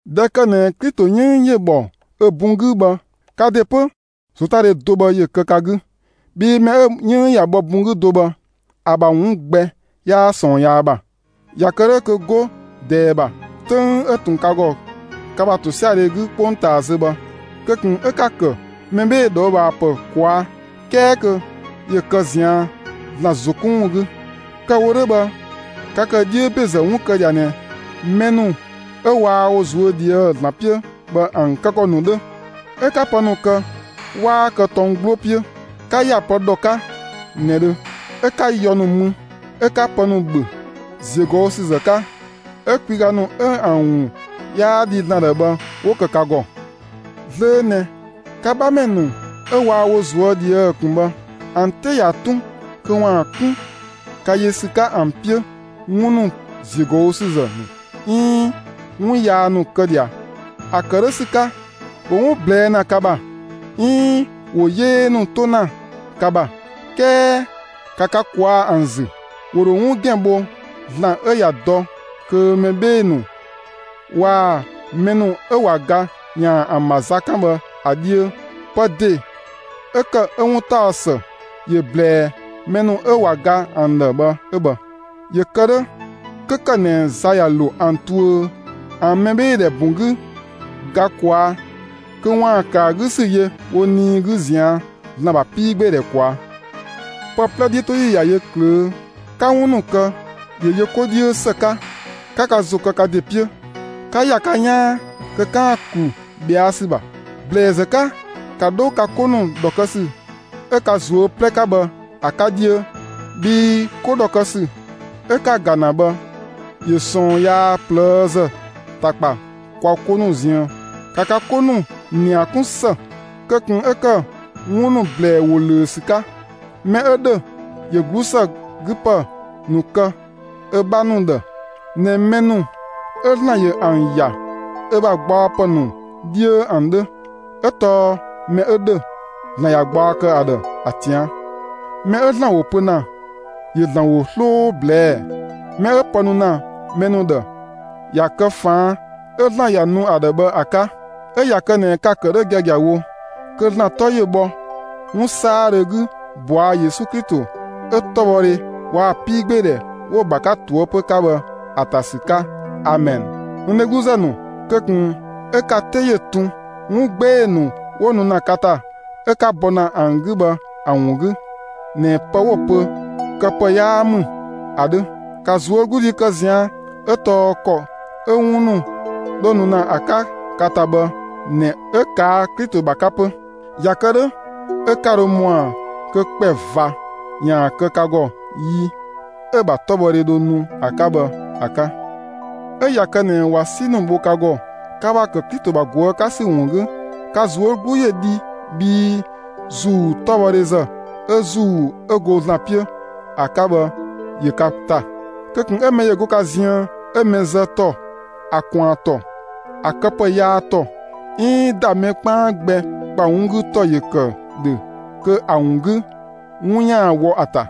꞊Dhɛ ‑kë ꞊nɛ Klito 'yënng ‑yö ‑bhɔ ö bun 'gü bhë, ka ‑de 'pö ‑zotadhe do bhë ‑yö kë ka 'gü, bhii mɛ 'ö‑ 'yënng ꞊ya bhɔ bun 'gü do bhë, ‑a ‑bha 'wun gbɛ 'yaa ꞊sɔɔn yaa ‑bha. ꞊Ya kë 'dhö kö 'go ꞊dɛɛ ‑bha, 'töng 'ö ꞊tun ka ‑gɔ ka ‑bha ‑tosiadhe 'gü 'kpongtaa zö bhë, kö ꞊kun 'ö 'ka‑ ‑kë mɛ 'bhee‑ ꞊dhɔɔbhaapë ꞊kwaa'; 'kɛɛ kö ‑yö kë ꞊zian' ‑Zlan ‑zo 'kun ‑wun 'gü. Kë‑ wo 'dhö bhë, ka ‑kë 'dhiö ‑bezë 'wun kë ꞊dhia ꞊nɛ mɛ ‑nu 'ö waa wo ꞊zuö' ꞊dhië'‑ ‑Zlan 'piö bhë ‑an kë ‑kɔ ‑nu 'dhö; 'ö 'ka pë ‑nu kë, 'waa kë tɔng 'gbloo 'piö; 'ka ‑ya pë ‑dhɔ 'ka ꞊nëdhö; 'ö 'ka yɔ ‑nu mü 'ö 'ka pë ‑nu ‑bhö ‑ziögɔüsüzë 'ka; 'ö kwiga ‑nu 'ö ‑an ‑wun 'yaa dhi ‑Zlan ‑dhë bhë 'wo ‑kë ka ‑gɔ. Zlöö ꞊nɛ, ka 'bhamɛ ‑nu 'ö waa wo ꞊zuö' ꞊dhië' ꞊kun bhë, ‑an 'te ꞊ya 'tun kö ‑waan 'kun ka yö ‑sü 'ka ‑an 'piö 'wun ‑nu ‑ziögɔüsüzë ‑nu 'iin 'wun yaa ‑nu kë ꞊dhia. ‑A ‑kë 'dhö ‑sü 'ka, ‑wo 'wun ꞊blɛɛ' ‑na ka ‑bha, 'iin ‑wo 'yee ‑nu 'to ‑na ka ‑bha. 'Kɛɛ ‑ka ka ꞊kwaa' ‑an ‑zü! ‑Wo ‑dho 'wun ‑gɛn bho ‑Zlan 'ö ꞊ya dɔ kö mɛ 'bhee‑ ‑nu waa‑ mɛ ‑nu 'ö ꞊wa ga ‑yaan ‑a ‑bha za 'kan bhë ‑a 'dhiö. Pë ‑de 'ö ‑kë 'ö 'wuntaɔsë ‑yö ꞊blɛɛ mɛ ‑nu 'ö ꞊wa ga ‑an ‑dhë 'ö bhë; ‑yö kë 'dhö, 'kö ‑kë ꞊nɛ za ꞊ya ‑lo ‑an tuö ‑an mɛbheedhɛ ‑bun 'gü ga ꞊kwaa', kö ‑waan ‑kë ‑a 'gü ‑sü yö wo nii 'gü ꞊zian' ‑Zlan ‑bha 'piigbeedhɛ ꞊kwaa'. Pë 'plɛ 'dhiötoyi ꞊ya yö ꞊klöö'; 'ka 'wun ‑nu kë, ‑yö yö 'ko 'dhiö ‑së 'ka; ‑ka ka ‑zo kë ka ‑de 'piö, 'ka ‑ya ka 'yaan kö 'kaan‑ ‑klu ꞊bhɛa' ‑sü ‑bha. ‑Blɛɛzë 'ka, ‑ka 'dho ka 'ko ‑nu ‑dhɔ kë ‑sü 'ö ka ꞊zuö' 'plɛ 'ka bhë ‑a 'ka 'dhiö, bhii 'ko ‑dhɔ kë ‑sü 'ö 'ka‑ ‑ga ‑na bhë, ‑yö ꞊sɔɔn yaa ꞊plëëzë ‑ta ‑kpa kwa 'ko ‑nu ziën. ‑Ka ka 'ko ‑nu ‑nia 'kun ‑së; kö ꞊kun 'ö ‑kë 'wun ‑nu ‑blɛɛ ‑wo ꞊löö ‑sü 'ka. Mɛ 'ö ‑dhö, ‑yö 'glusëgüpë ‑nu kë ö 'bha ‑nu ‑dhë ꞊nɛ mɛ ‑nu 'ö ‑Zlan ‑yö ‑an ‑ya ö ‑bha gbaɔpë ‑nu 'dhiö ‑an 'dhö. 'Ö tɔɔ mɛ 'ö ‑dhö, ‑Zlan ꞊ya gbaɔ kë ‑a ‑dhë ‑a ꞊tian'. Mɛ 'ö ‑Zlan ‑wo pö ‑na, ‑yö ‑Zlan ‑wo 'sloo ꞊blɛɛ'‑; mɛ 'ö pë ‑nu kë ‑na mɛ ‑nu ‑dhë, ‑ya kë ꞊faan' 'ö ‑Zlan ‑ya nu ‑a ‑dhɛ bhɛ ‑a 'ka. 'Ö ꞊ya kë ꞊nɛ ka‑ ‑kë 'dhö giagiawo, kö ‑Zlan 'tɔ ‑yö bhɔ 'wun 'saadhö 'gü ꞊bɔa' Yesu Klito 'ö 'tɔbhɔdhe waa‑ 'piigbeedhɛ 'wo‑ ‑bha 'ka ꞊toëpö 'ka bhë ‑a ‑ta ‑sü 'ka, amɛn. N dhegluzë ‑nu, kö ꞊kun 'ö ka 'te ‑yö tun 'wun 'gbee‑ ‑nu 'wo nu ‑na ka ‑ta 'ö 'ka bɔ ‑na ‑an 'gü bhë ‑a ‑wun 'gü ꞊nɛ pë 'wo‑ pö kë pë 'yaa ‑mü ‑a 'dhö. ‑Ka ꞊zuögludhi kë ꞊zian' 'ö tɔɔ ‑kɔ 'ö 'wun ‑nu 'dho nu ‑na ‑a 'ka ka ‑ta bhë ꞊nɛ 'ö ꞊kaa' Klito ‑bha 'ka 'pö. ꞊Ya kë 'dhö 'ö 'ka dho ‑mɔa kö ‑kpɛ ꞊va ‑yaan kë ka ‑gɔ yi 'ö‑ ‑bha 'tɔbhɔdhe dho nu ‑a 'ka bhë ‑a 'ka. 'Ö ꞊ya kë ꞊nɛ ꞊wa 'si ‑nu bho ka ‑gɔ, ka ‑bha ‑kë Klito ‑bha ꞊guë' 'ka ‑sü ‑wun 'gü, ka ꞊zuö' 'glu ‑yö dhi bhii ‑Zuu 'tɔbhɔdhe ‑zë 'ö ‑Zuu 'ö go ‑Zlan 'piö ‑a 'ka bhë ‑yö ka ‑ta. Kö ꞊kun 'ö mɛ ‑yö go ka ziën 'ö‑ mɛ zë ‑tɔ, ‑a ꞊kwaan ‑tɔ, ‑a këpë yaa ‑tɔ, 'iin ‑da mɛ 'kpaan gbɛ ‑bha 'wun 'gü ‑tɔ ‑yö ‑kë ‑dhö kö ‑a ‑wun 'gü 'wun ‑yaan wɔ ‑a ‑ta.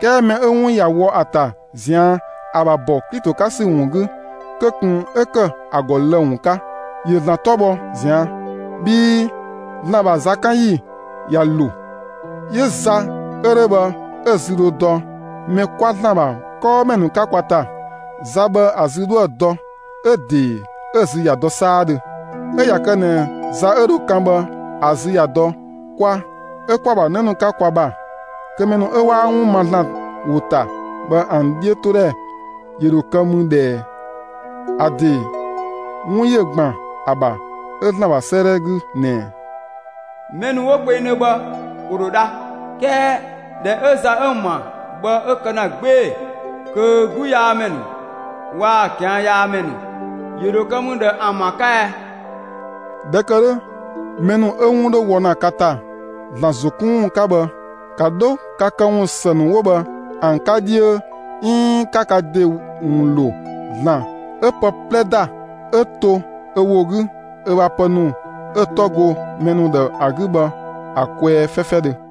'Kɛɛ mɛ 'ö 'wun ꞊ya wɔ ‑a ‑ta ꞊zian' ‑a ‑bha ‑bɔ Klito 'ka ‑sü ‑wun 'gü, kö ꞊kun 'ö ‑kë ‑a ‑gɔ lë‑ ‑wun 'ka; ‑yö ‑Zlan 'tɔ bhɔ ꞊zian'. Bhii ‑Zlan ‑bha zakanyi ꞊ya ‑lo. 'Yö za 'ö 'dhö bhë 'ö‑ zü dhö dɔ mɛ 'kwa ‑Zlan ‑bha 'kɔɔmɛ ‑nu 'ka kwa ‑ta. Za bhë ‑a zü dhoë dɔ; 'ö‑ ‑de 'ö‑ zü ꞊ya dɔ 'saadhö. 'Ö ꞊ya kë ꞊nɛ za 'ö dho kan bhë ‑a zü ꞊ya dɔ kwa ('ö kwa‑ ‑bha 'në ‑nu 'ka kwa) ‑bha, kö mɛ ‑nu 'ö 'waa 'wun ma ‑Zlan ‑wo ‑ta bhë ‑an 'dhiötodhɛ ‑yö ‑dho kë mü ꞊dhë ꞊ɛɛ? ‑A ‑de 'wun ‑yö ‑gban ‑a ‑bha ‑Zlan ‑bha 'sëëdhɛ 'gü ꞊nɛ: Mɛ ‑nu 'ö 'wo kpengdhö bhë ‑wo ‑dho dha. 'Kɛɛ ꞊dhɛ 'ö za 'ö ‑an ‑bha bhë 'ö kë ‑na 'gbee‑, kö 'gluyaamɛ ‑nu waa‑ ꞊kianyaamɛ ‑nu, ‑yö ‑dho kë mü ꞊dhë ‑an ‑bha 'ka ɛɛ? ꞊Dhɛ ‑kë 'dhö, mɛ ‑nu 'ö 'wun 'dho wɔ ‑na ka ‑ta ‑Zlan ‑zo 'kun ‑wun 'ka bhë, ‑ka 'dho ka këwun ‑së ‑nu 'wo bhë ‑an 'ka 'dhiö 'iin 'ka ka ‑de ‑wun ‑lo ‑Zlan 'ö pë 'plɛ ‑da, 'ö to ö ‑wo 'gü ö ‑bha pë ‑nu 'ö‑ 'tɔ go mɛ ‑nu ‑dhë ‑a 'gü bhë ‑a kwɛɛ 'fɛfɛdhö.